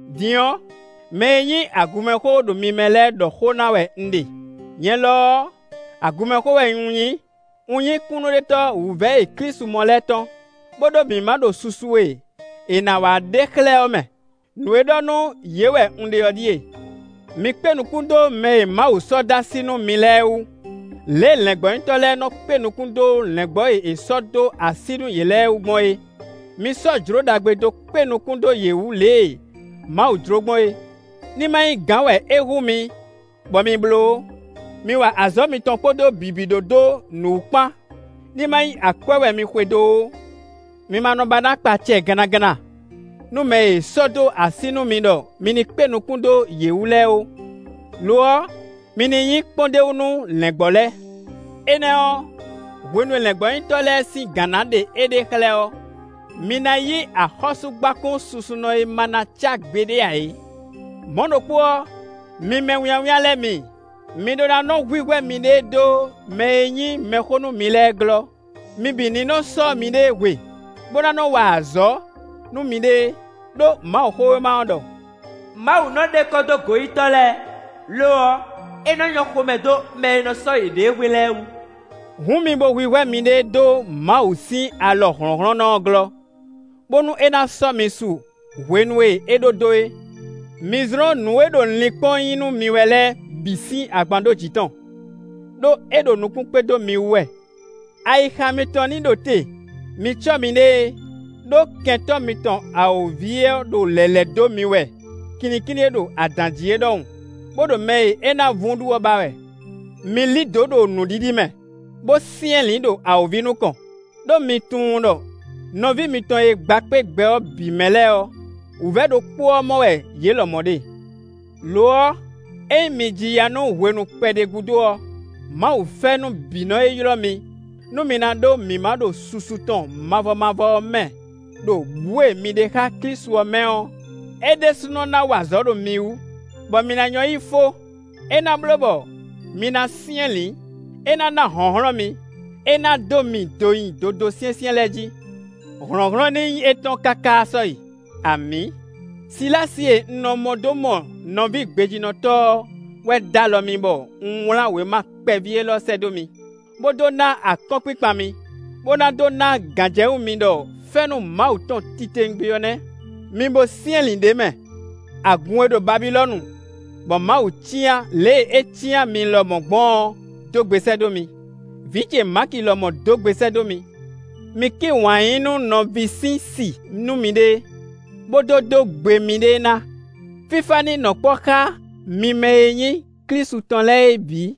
Din ɔ́, mɛ e nyí agunmɛxó ɖo mi mɛ lɛ́ɛ ɖɔ xó ná wɛ un ɖe. Nyɛ lɔ ɔ́, agunmɛxó wɛ un nyí; un nyí kúnnuɖetɔ́ wǔvɛ́ e Klísu mɔ lɛ́ɛ tɔn, bó ɖó mǐmá ɖo susu e è nǎ wá ɖe xlɛ́ ɔ́ mɛ. Nǔ e ɖɔ nú yě wɛ un ɖe ɔ́ ɖíe: mi kpé nukún dó mɛ e Mawu sɔ́ dó así nú mi lɛ́ɛ wú, lě e lɛ̌ngbɔ́nyitɔ́ lɛ́ɛ nɔ kpé nukún dó lɛ̌ngbɔ́ e è sɔ́ dó así nú yě lɛ́ɛ wú gbɔn é; mi sɔ́ jlǒ ɖagbe dó kpé nukún dó yě wú lě e Mawu jló gbɔn é; ní ma nyí gǎn wɛ é hú mi bɔ mi bló ó. Mi wa azɔ̌ mitɔn kpódó bǐbí ɖó dó nǔ wǔ kpán; ní ma nyí akwɛ́ wɛ mi xwedó ó. Mi ma nɔ ba ná kpa acɛ gannaganna nú mɛ e è sɔ́ dó así nú mi ɖɔ mi ní kpé nukún dó yě wú lɛ́ɛ ó; lo ɔ́, mi ní nyí kpɔ́ndéwú nú lɛ̌ngbɔ́ lɛ́ɛ. Énɛ́ ɔ́, hwenu e lɛ̌ngbɔ́nyitɔ́ lɛ́ɛ sín gǎn ná ɖe éɖée xlɛ́ ɔ́, mi ná yí axɔ́súgbákún susunɔ e ma ná cá gbeɖé ǎ é. Mɔ̌ ɖokpó ɔ́, mi mɛwínnyáwínnyá lɛ́ɛ mi, mi ɖó ná nɔ́ hwíhwɛ́ miɖée dó mɛ e nyí mɛxó nú mi lɛ́ɛ glɔ́; mi bǐ ní nɔ sɔ́ miɖée hwe, bó ná nɔ wa azɔ̌ nú miɖée, ɖó Mawuxówéma ɔ́ ɖɔ: “Mawu nɔ ɖe kɔ dó goyítɔ́ lɛ́ɛ; lo ɔ́, é nɔ nyɔ́ xomɛ dó mɛ e nɔ sɔ́ yěɖée hwe lɛ́ɛ wú.” Hǔn mi bo hwíhwɛ́ miɖée dó Mawu sín alɔ hlɔ̌nhlɔ́nnɔ ɔ́ glɔ́, bónú é ná sɔ́ mi su hwenu e é ɖó dó é. Mi zlɔ́n nǔ e ɖo linkpɔ́n nyí nú mi wɛ lɛ́ɛ bǐ sín agban ɖó jǐ tɔn, ɖó é ɖo nukún kpé dó mi wú wɛ. Ayixa mitɔn ní ɖo te; mi cɔ́ miɖée, ɖó kɛntɔ́ mitɔn awǒvi ɔ́ ɖo lɛ̌ lɛ́ dó mi wɛ kinnikínní e ɖo adǎn jí é ɖɔhun, bó ɖo mɛ e é ná vún ɖu ɔ́ ba wɛ. Mi lí dǒ ɖo nǔɖiɖi mɛ, bó syɛ́nlǐn ɖo awǒvi nukɔn, ɖó mi tunwun ɖɔ nɔví mitɔn e gba kpé gbɛ ɔ́ bǐ mɛ lɛ́ɛ ɔ́, wǔvɛ́ ɖokpó ɔ́ mɔ wɛ yě lɔmɔ̌ ɖe. Lo ɔ́, ényí mi ji ya nú hwenu kpɛɖé gúdo ɔ́, Mawu fɛ́nú bǐ nɔ e ylɔ́ mi nú mi ná ɖó mǐmá ɖo susu tɔn mavɔ mavɔ ɔ́ mɛ, ɖo bǔ e mi ɖe xá Klísu ɔ́ mɛ ɔ́, é ɖésúnɔ ná wa azɔ̌ ɖo mi wú, bɔ mi ná nyɔ́ yí fó; é ná bló bɔ mi ná syɛ́nlǐn; é ná ná hlɔ̌nhlɔ́n mi; é ná dó mi do nyi dodó syɛ́nsyɛ́n lɛ́ɛ jí. Hlɔ̌nhlɔ́n ní nyí étɔn káká sɔ́yi! Amǐ. Silási e un nɔ mɔ dó mɔ nɔví gbejínɔtɔ́ ɔ́ wɛ dó alɔ mì bɔ un wlán wěma kpɛví élɔ́ sɛ́ dó mi, bó dó ná akɔ́nkpinkpan mi, bó ná dó ná gǎnjɛwú mi ɖɔ fɛ́nú Mawu tɔn titewungbe ɔ́ nɛ́. Mi bo syɛ́nlǐn ɖ'é mɛ. Agun e ɖo Babilɔ́nu bɔ Mawu cyán lě e é cyán mi lɔmɔ̌ gbɔn ɔ́ dó gbe sɛ́ dó mi; vǐ ce Maki lɔmɔ̌ dó gbe sɛ́ dó mi. Mi kí wǎn yí nú nɔví sín si nú miɖée, bó dó dó gbe miɖée ná. Fífá ní nɔ kpɔ́ xá mi mɛ e nyí Klísu tɔn lɛ́ɛ é bǐ.